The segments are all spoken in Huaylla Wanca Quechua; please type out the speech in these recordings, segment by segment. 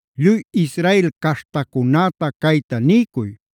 “Lluy Israel caśhtacunäta cayta niycuy: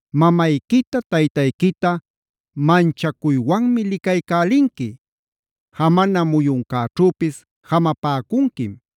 “Mamayquita taytayquita manchacuywan licaycälinqui.b “Jamana muyuncäćhüpis jamapäcunquim.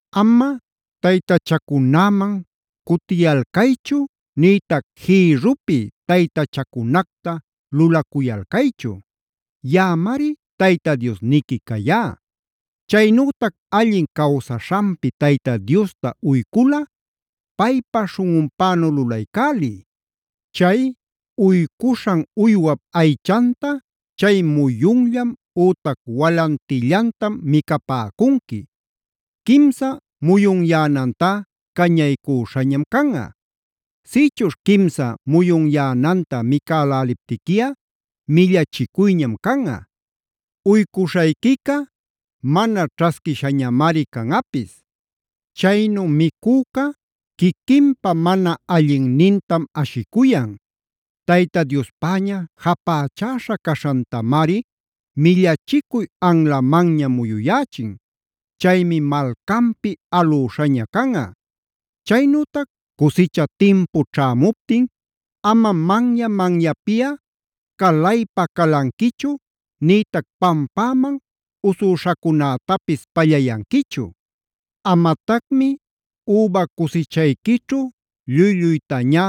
“Ama taytachacunäman cutiyalcaychu nïtac jïrrupi taytachacunacta lulacuyalcaychu.d Yaꞌamari Tayta Diosniqui cayá. “Chaynütac allin cawsaśhanpi Tayta Diosta uyculꞌa paypa śhunꞌunpänu lulaycäliy. Chay uycuśhan uywap aychanta chay muyunllam ütac walantillantam micapäcunqui. Quimsa muyunyänantá cañaycüśhañam canꞌa. Sïchuśh quimsa muyunyänanta micäläliptiquiꞌa millachicuyñam canꞌa; uycuśhayquica mana ćhasquishañamari canꞌapis. Chaynu micüca quiquinpa mana allinnintam ashicuyan; Tayta Diospäña japächäśha caśhantamari millachicuy anlamanña muyuyächin. Chaymi malcanpi alüśhaña canꞌa. “Chaynütac cusicha timpu ćhämuptin amam manya-manyapiꞌa calaypa-calanquichu nïtac pampäman usüśhacunätapis pallayanquichu. Amatacmi üba cusichayquićhu lluy-lluytañá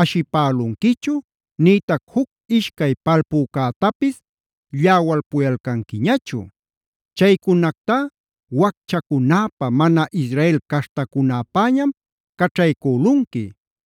ashipälunquichu nïtac juc ishcay palpücätapis lläwalpuyalcanquiñachu. Chaycunactá wacchacunäpä, mana Israel caśhtacunäpäñam caćhaycülunqui.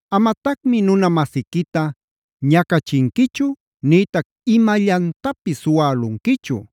“Amatacmi nuna-masiquita ñacachinquichu nïtac imallantapis suwälunquichu.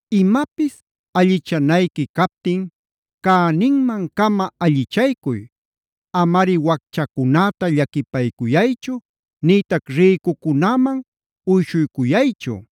“Imapis allichanayqui captin cäninman-cama allichaycuy. Amari wacchacunäta llaquipayaychu nïtac ricucunäman uyshuycuyaychu.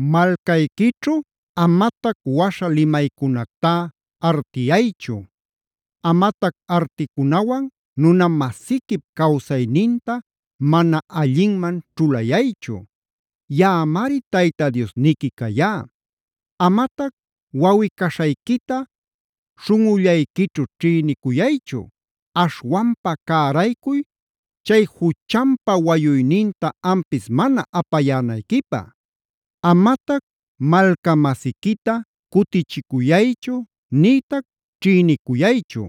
Malcayquićhu amatac waśha limaycunactá artiyaychu. Amatac articunawan nuna-masiquip cawsayninta mana allinman ćhulayaychu. Yaꞌamari Tayta Diosniqui cayá. “Amatac wawꞌi-caśhayquita śhunꞌullayquićhu ćhïnicuyaychu. Aśhwanpa cäraycuy chay juchanpal wayuyninta ampis mana apayänayquipä. Amatac malca-masiquita cutichicuyaychu nïtac ćhïnicuyaychu.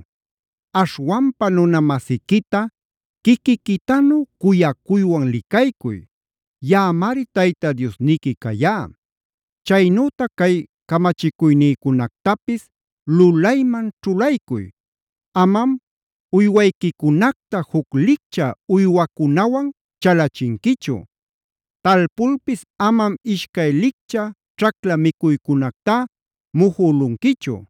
Aśhwanpa nuna-masiquita quiquiquitanu cuyacuywan licaycuy.m Yaꞌamari Tayta Diosniqui cayá. “Chaynütac cay camachicuynïcunactapis lulayman ćhulaycuy: Amam uywayquicunacta juc licchä uywacunawan chalachinquichu. Talpulpis amam ishcay licchä ćhacla micuycunactá mujülunquichu.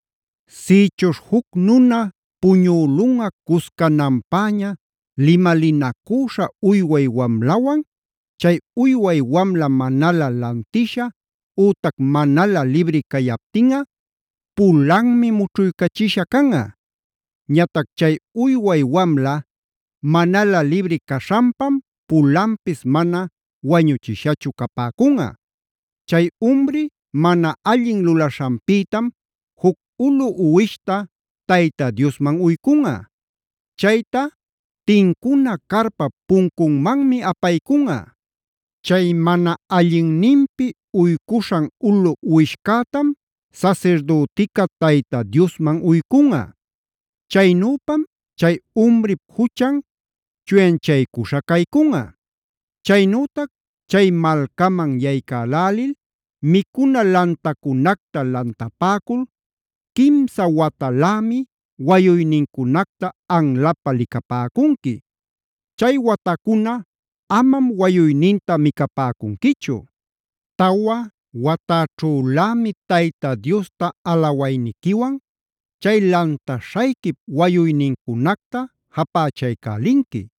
“Sïchuśh juc nuna puñülunꞌa cuscananpäña limalinacüśha uyway wamlawan, chay uyway wamla manalä lantisha ütac manalä libri cayaptinꞌa, pulanmi mućhuycachisha canꞌa. Ñatac chay uyway wamla manalä libri caśhanpam pulanpis mana wañuchishachu capäcunꞌa. Chay umri mana allin lulaśhanpïtam juc ulu uwishta Tayta Diosman uycunꞌa. Chayta tincuna carpap puncunmanmi apaycunꞌa. Chay mana allinninpi uycuśhan ulu uwishcätam sasirdütica Tayta Diosman uycunꞌa. Chaynüpam chay umrip juchan chuyanchaycuśha caycunꞌa. “Chaynütac chay malcaman yaycälälil micuna lantacunacta lantapäcul quimsa watalämi wayuynincunacta anlapä licapäcunqui. Chay watacuna amam wayuyninta micapäcunquichu. Tawa watäćhülämi Tayta Diosta alawayniquiwan chay lantaśhayquip wayuynincunacta japächaycälinqui.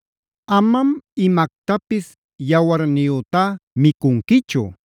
“Amam imactapis yawarniyütá micunquichu.o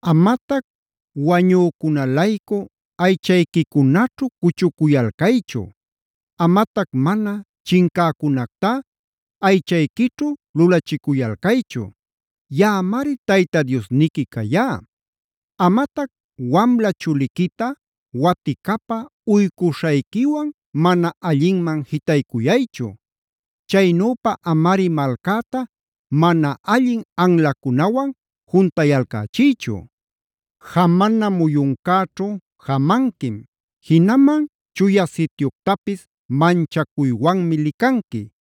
“Amatac wañücuna-laycu aychayquicunaćhu cuchucuyalcaychu; amatac mana chincäcunactá aychayquićhu lulachicuyalcaychu.q Yaꞌamari Tayta Diosniqui cayá. “Amatac wamla chuliquita waticapä uycuśhayquiwan mana allinman jitaycuyaychu.r Chaynüpa amari malcäta mana allin anlacunawan juntayalcächiychu. “Jamana muyuncäćhu jamanquim; jinaman Chuya Sityuctapis manchacuywanmi licanqui.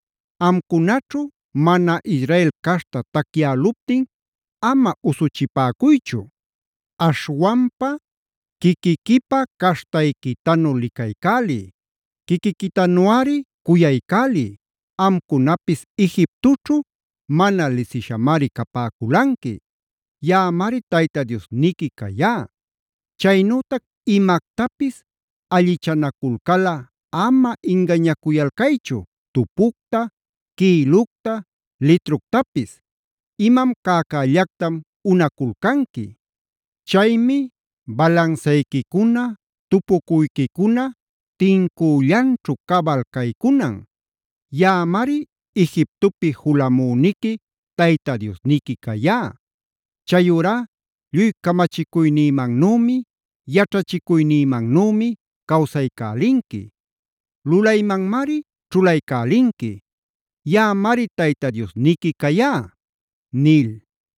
“Amcunaćhu mana Israel caśhta tacyäluptin ama usuchipäcuychu. Aśhwanpa quiquiquipa caśhtayquitanu licaycäliy; quiquiquitanuꞌari cuyaycäliy, amcunapis Egiptoćhu mana lisishamari capäculanqui.u Yaꞌamari Tayta Diosniqui cayá. “Chaynütac imactapis allichanaculcalꞌa ama ingañacuyalcaychu tupucta, quïlucta, litructapis; imam cäcällactam unaculcanqui. Chaymi balansayquicuna, tupucuyquicuna tincüllanćhu cabal caycunan.v Yaꞌamari Egiptopi julamüniqui Tayta Diosniqui cayá. “Chayurá lluy camachicuynïmannümi, yaćhachicuynïmannümi cawsaycälinqui; lulaymanmari ćhulaycälinqui. Yaꞌamari Tayta Diosniqui cayá” nil.